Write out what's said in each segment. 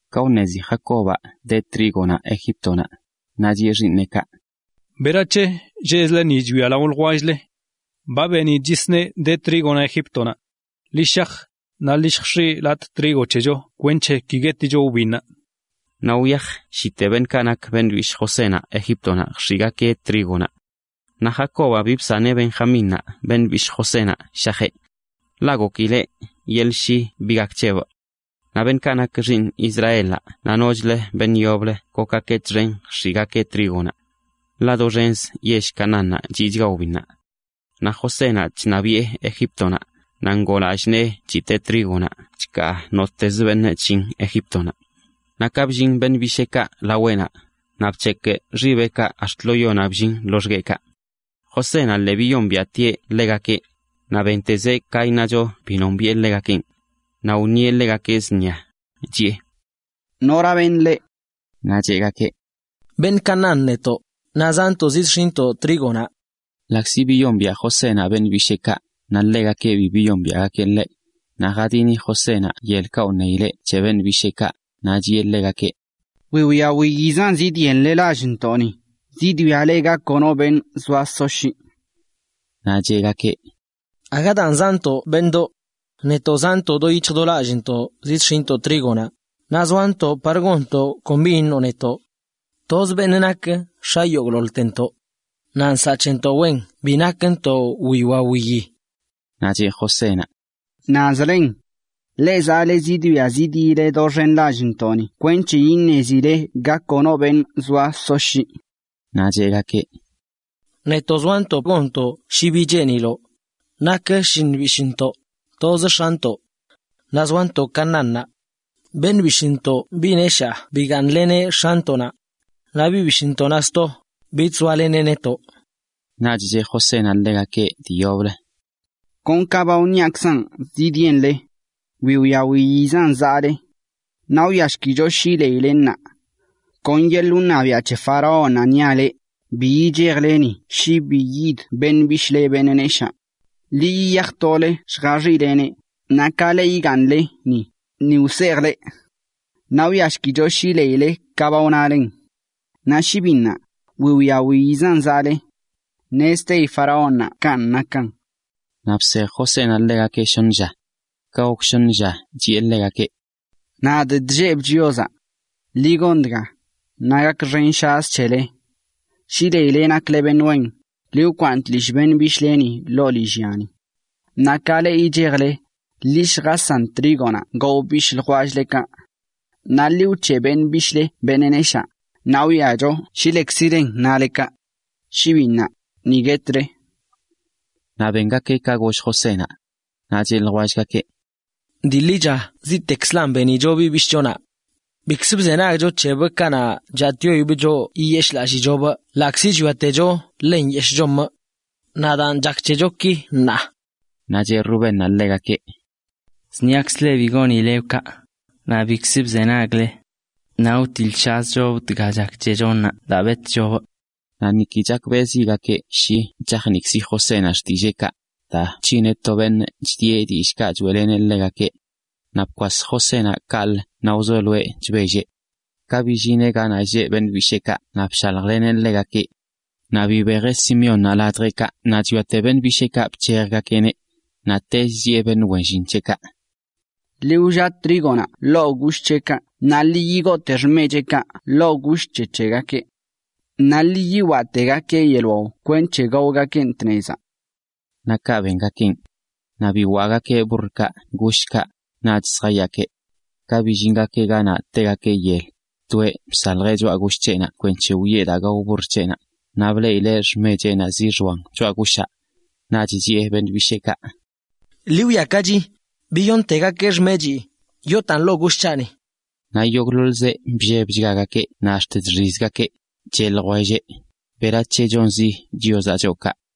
Ka wṉezi Jacobaꞌ de trígonaꞌ Egíptonaꞌ, naꞌ chiꞌe xiiṉeꞌkaꞌ: ―¿Berac̱he lleꞌzle ni chwia lao ljwell-le? Ba benidꞌ nagakeꞌ de trígonaꞌ Egíptonaꞌ. Ḻi shaj, naꞌ ḻi lljx̱iꞌ latꞌ trigo c̱hecho kwenc̱he ki gueticho wbinnaꞌ. Naꞌ wyaj shite beṉꞌkaꞌ nak beṉꞌ bishꞌ Josénaꞌ Egíptonaꞌ, lljx̱iꞌgakeꞌ trígonaꞌ. Naꞌ Jacobaꞌ bi bsaneꞌ Benjamínnaꞌ beṉꞌ bishꞌ Josénaꞌ shajeꞌ. Ḻaꞌ gokileꞌ: “Yeḻꞌ shi bi gak c̱hebꞌ.” Naꞌ beṉꞌkaꞌ nak xiiṉ Israelaꞌ naꞌ nochlə beṉꞌ yoblə gokgakeꞌ txen lljx̱iꞌgakeꞌ trígonaꞌ. Ḻaꞌ doxenzə yell Canaánnaꞌ chiꞌchachga wbinnaꞌ. Naꞌ Josénaꞌ chṉabiꞌe Egíptonaꞌ, naꞌ ngoo lallꞌ nee chitee trígonaꞌ chkaa nottezə beṉꞌ chllin Egíptonaꞌ. Naꞌ ka bllin beṉꞌ bisheekaꞌ laweꞌnaꞌ, naꞌ bc̱hekꞌ xibeꞌkaꞌ ax̱t lo yonaꞌ bllin loxgueꞌkaꞌ. Josénaꞌ lii biyombiaꞌtieꞌ ḻegakeꞌ, naꞌ bentezeꞌ ka iṉacho bi nombiꞌe ḻegakenꞌ. Naꞌ wṉieꞌ ḻegakeꞌ zṉia, chiꞌe: ―¿Nora beṉꞌ leꞌ? Naꞌ cheꞌgakeꞌ: ―Beṉꞌ Canaán netoꞌ, naꞌ zaantoꞌ zidx̱iꞌntoꞌ trígonaꞌ. Ḻaꞌkzi biyombiaꞌ Josénaꞌ beṉꞌ bisheekaꞌ, naꞌ ḻegakeꞌ bi biyombiaꞌgakeꞌ ḻeꞌ. Naꞌ jadini Josénaꞌ yelkaꞌ wṉeileꞌ c̱he beṉꞌ bisheekaꞌ, naꞌ chiꞌe ḻegakeꞌ: ―Wiwia wiyizan zidyenle lallntoꞌni, zidwiazle ga kono beṉꞌ zoa soshyiꞌ. Naꞌ cheꞌgakeꞌ: ―Aga daan zaꞌntoꞌ, beṉꞌdoꞌ. Netoꞌ zaꞌntoꞌ do yic̱hj do lallꞌntoꞌ zidx̱iꞌntoꞌ trígonaꞌ, naꞌ zoantoꞌ xḻatjin gonntoꞌ kon bi iṉoꞌ netoꞌ. Toz beṉꞌ nakeꞌ x̱a yogꞌḻoḻtentoꞌ naꞌ nsaꞌ c̱hentoꞌ wen bi nakntoꞌ wiwia wiyi. Naꞌ c̱he Josénaꞌ: ―Naꞌzlen. Leꞌ zaale zidwia zidyile doxen lallntoꞌni kwenc̱he iṉezile ga kono beṉꞌ zoa soshyiꞌ. Naꞌ cheꞌgakeꞌ: ―Netoꞌ zoantoꞌ xḻatjin gonntoꞌ kon bi iṉoꞌ netoꞌ, nak shlliṉ bishꞌntoꞌ toz x̱antoꞌ naꞌ zoantoꞌ Canaánnaꞌ. Beṉꞌ bishꞌntoꞌ beṉꞌ neshaa bigaaṉleneꞌ x̱antoꞌnaꞌ, naꞌ beṉꞌ bishꞌntoꞌnaꞌ sto, bich zoaleneꞌ netoꞌ. Naꞌch cheꞌ Josénaꞌ ḻegakeꞌ dii yoblə: ―Kon ka ba wṉiaꞌkzanꞌ zidyenle. Wiwia wiyinaꞌzan zaꞌle. Naꞌ wwiashkicho shi leile ṉaa. Kon yeḻꞌ wṉabiaꞌ c̱he faraónnaꞌ niaꞌ leꞌ, bi yichejile ni shi bi yidə beṉꞌ bishꞌle beṉꞌ neshaa. Ḻi yiyaj tole lljaxileneꞌ, naꞌ ka leꞌ yigaaṉle ni, ni wsejꞌ leꞌ. Naꞌ wwiashkicho shi leilen ka ba wnale. Naꞌ shi bi ṉaa, wiwia wiyizan zaꞌle. ¡Ṉezteyi faraónnaꞌ kanꞌ nakan! Naꞌ bsej Josénaꞌ ḻegakeꞌ shoṉə lla. Ka gok shoṉə lla chiꞌe ḻegakeꞌ: ―Nadꞌ chllebꞌ Chiozaꞌ. Ḻi gon dga, naꞌ gakxenshazꞌ(shaz?) c̱hele: shi leile nakle beṉꞌ wen, ḻi wkwaaṉ tlishꞌ beṉꞌ bishꞌleni ḻoo lillyani. Naꞌ ka leꞌ yichejle, ḻi lljasan trígonaꞌ gao bishꞌ ljwell-lekaꞌ. Naꞌ ḻi wc̱heꞌ beṉꞌ bishꞌle beṉꞌ neshaa, naꞌ wwiacho shi lekzilen nale kaꞌ. Shi bin ṉaa, ni guetle. Naꞌ bengakeꞌ ka goll Josénaꞌ. Naꞌ cheꞌ ljwellgakeꞌ: ―Dii ḻicha ziꞌtekzlan benicho biꞌ bishꞌchonaꞌ. Bikzə bzenagcho c̱hebꞌ kanaꞌ chatꞌyoibꞌ choꞌ yiyeshichobꞌ ḻaꞌkzi chwiatecho ḻe nyeshꞌ chomꞌ. Naꞌ daan chak c̱hecho ki ṉaa. Naꞌ cheꞌ Rubénnaꞌ ḻegakeꞌ: ―Zṉiakzꞌ leꞌ bi gonileꞌbꞌ kaꞌ, naꞌ bikzə bzenagle. Naꞌ wtiḻꞌshazcho dga chak c̱hecho ṉaa daa betꞌchobꞌ. Naꞌ niki chakbeꞌzigakeꞌ shi chajniꞌkzi Josénaꞌ xtilleekaꞌ, daa bc̱hineꞌ to beṉꞌ chidieꞌ dillꞌkaꞌ choeꞌleneꞌ ḻegakeꞌ. Naꞌ bikwas Josénaꞌ kaꞌlə naꞌ wzoloeꞌ chbelleꞌ. Ka billineꞌ ganaꞌ lleꞌ beṉꞌ bisheekaꞌ naꞌ bshaljleneꞌ ḻegakeꞌ. Naꞌ bibejeꞌ Simeónnaꞌ ladjeꞌkaꞌ naꞌ chwiate beṉꞌ bisheekaꞌ bc̱hejgakeꞌneꞌ. Naꞌtech chiꞌe beṉꞌ wen llin c̱heꞌkaꞌ: ―Ḻi wllaꞌ trígonaꞌ ḻoo gosh c̱heꞌkaꞌ naꞌ lii yigoote xmecheꞌkaꞌ ḻoo gush c̱he c̱hegakeꞌ. Naꞌ lii yiwaꞌtegakeꞌ yeḻꞌ wao kwenc̱he gaogakeꞌn tnezaꞌ. Naꞌ kaꞌ bengakeꞌn. Naꞌ biwaꞌgakeꞌ burrkaꞌ gushkaꞌ, naꞌch zjayaakeꞌ. Ka billingakeꞌ ganaꞌ tegakeꞌ yel, toeꞌ bsaljeꞌ choꞌa gush c̱heꞌnaꞌ kwenc̱he wiꞌe daa gao burr c̱heꞌnaꞌ. Naꞌ bleꞌileꞌ xmecheꞌnaꞌ zixoan choꞌa gushaꞌ. Naꞌch chiꞌe beṉꞌ bisheekaꞌ: ―Ḻi wwiakachi, biyoṉtegakeꞌ xmechii, yootaan ḻoo gush c̱haꞌni. Naꞌ yogꞌḻoḻzeꞌ bllebchgagakeꞌ naꞌ ax̱t chxizgakeꞌ, cheꞌ ljwelleꞌ: ―¿Berac̱he chonzi Chiozaꞌ choꞌ kaꞌ?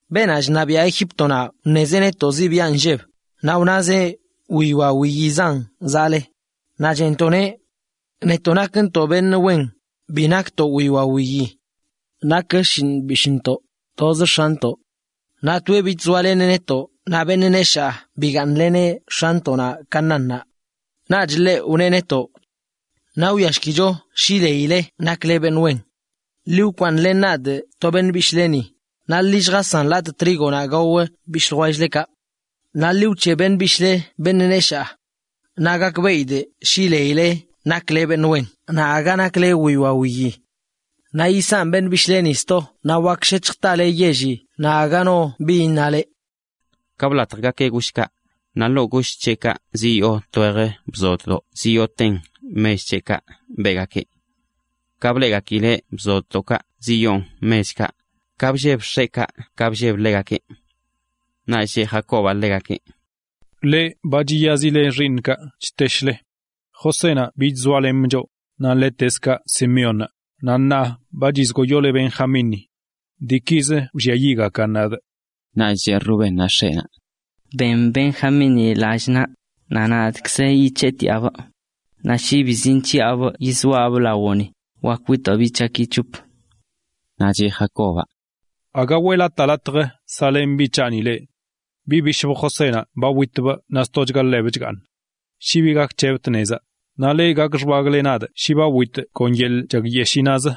―Beenaꞌ chṉabiaꞌ Egíptonaꞌ wṉelzeꞌ netoꞌ zṉia nlleb, naꞌ wnazeꞌ: “wiwia wiyizan zaꞌle.” Naꞌ cheꞌntoꞌneꞌ: “Netoꞌ nakntoꞌ beṉꞌ wen, bi nakntoꞌ wiwia wiyi. Nak shlliṉ bishꞌntoꞌ toz x̱antoꞌ. Naꞌ toeꞌ bich zoaleneꞌ netoꞌ naꞌ beṉꞌ neshaa bigaaṉleneꞌ x̱antoꞌnaꞌ Canaánnaꞌ.” Naꞌch ḻeꞌ wneꞌ netoꞌ: “Naꞌ wiashkicho shi leile nakle beṉꞌ wen. Ḻi wkwaaṉlen nadꞌ to beṉꞌ bishꞌleni, naꞌ ḻi lljasanlatꞌ trígonaꞌ gao xiiṉ xool-lekaꞌ. Naꞌ ḻi wc̱heꞌ beṉꞌ bishꞌle beṉꞌ neshaa. Naꞌ gakbeꞌidꞌ shi leile nakle beṉꞌ wen naꞌ aga nakle wiwia wiyi. Naꞌ yisanꞌ beṉꞌ bishꞌleni sto naꞌ wak shec̱hj tale yelli naꞌ aga no bi iṉale.” Ka blatjgakeꞌ gushkaꞌ, naꞌ ḻoo gush c̱heꞌkaꞌ ziyoo twej bzoddoꞌ ziyooten mech c̱heꞌkaꞌ beꞌgakeꞌ. Ka bleꞌgakileꞌ bzoddoꞌkaꞌ ziyoon mechkaꞌ, ka blleb x̱eꞌkaꞌ, ka blleb ḻegakeꞌ. Naꞌch cheꞌ Jacobaꞌ ḻegakeꞌ: ―Ba chiyazile xiiṉꞌkaꞌ chteshle. Josénaꞌ bich zoalemꞌ choꞌ, naꞌ ḻetezkaꞌ Simeónnaꞌ, naꞌ ṉaa ba chizgoyole Benjamínni. Diikizə wlliayiꞌgakan nadꞌ. Naꞌch cheꞌ Rubénnaꞌ x̱eꞌnaꞌ: ―Ben Benjamínni lallꞌ naꞌ, naꞌ nadꞌkzə yic̱heꞌtiaꞌbꞌ, naꞌ shi bi zinc̱hiꞌabꞌ yizoaꞌbꞌ lawoꞌni, wak witoꞌ biꞌ c̱haꞌki c̱hop. Naꞌ cheꞌ Jacobaꞌ: ―Aga weꞌlatꞌ latj saꞌlen biꞌ c̱haꞌni leꞌ. Biꞌ bishꞌbꞌ Josénaꞌ ba witbꞌ naꞌ stochga ḻebꞌ chgaaṉ. Shi bi gak c̱hebꞌ tnezaꞌ naꞌ leꞌ gak xbagꞌle nadꞌ shi ba witidꞌ yeḻꞌ chakyeshiinaꞌz.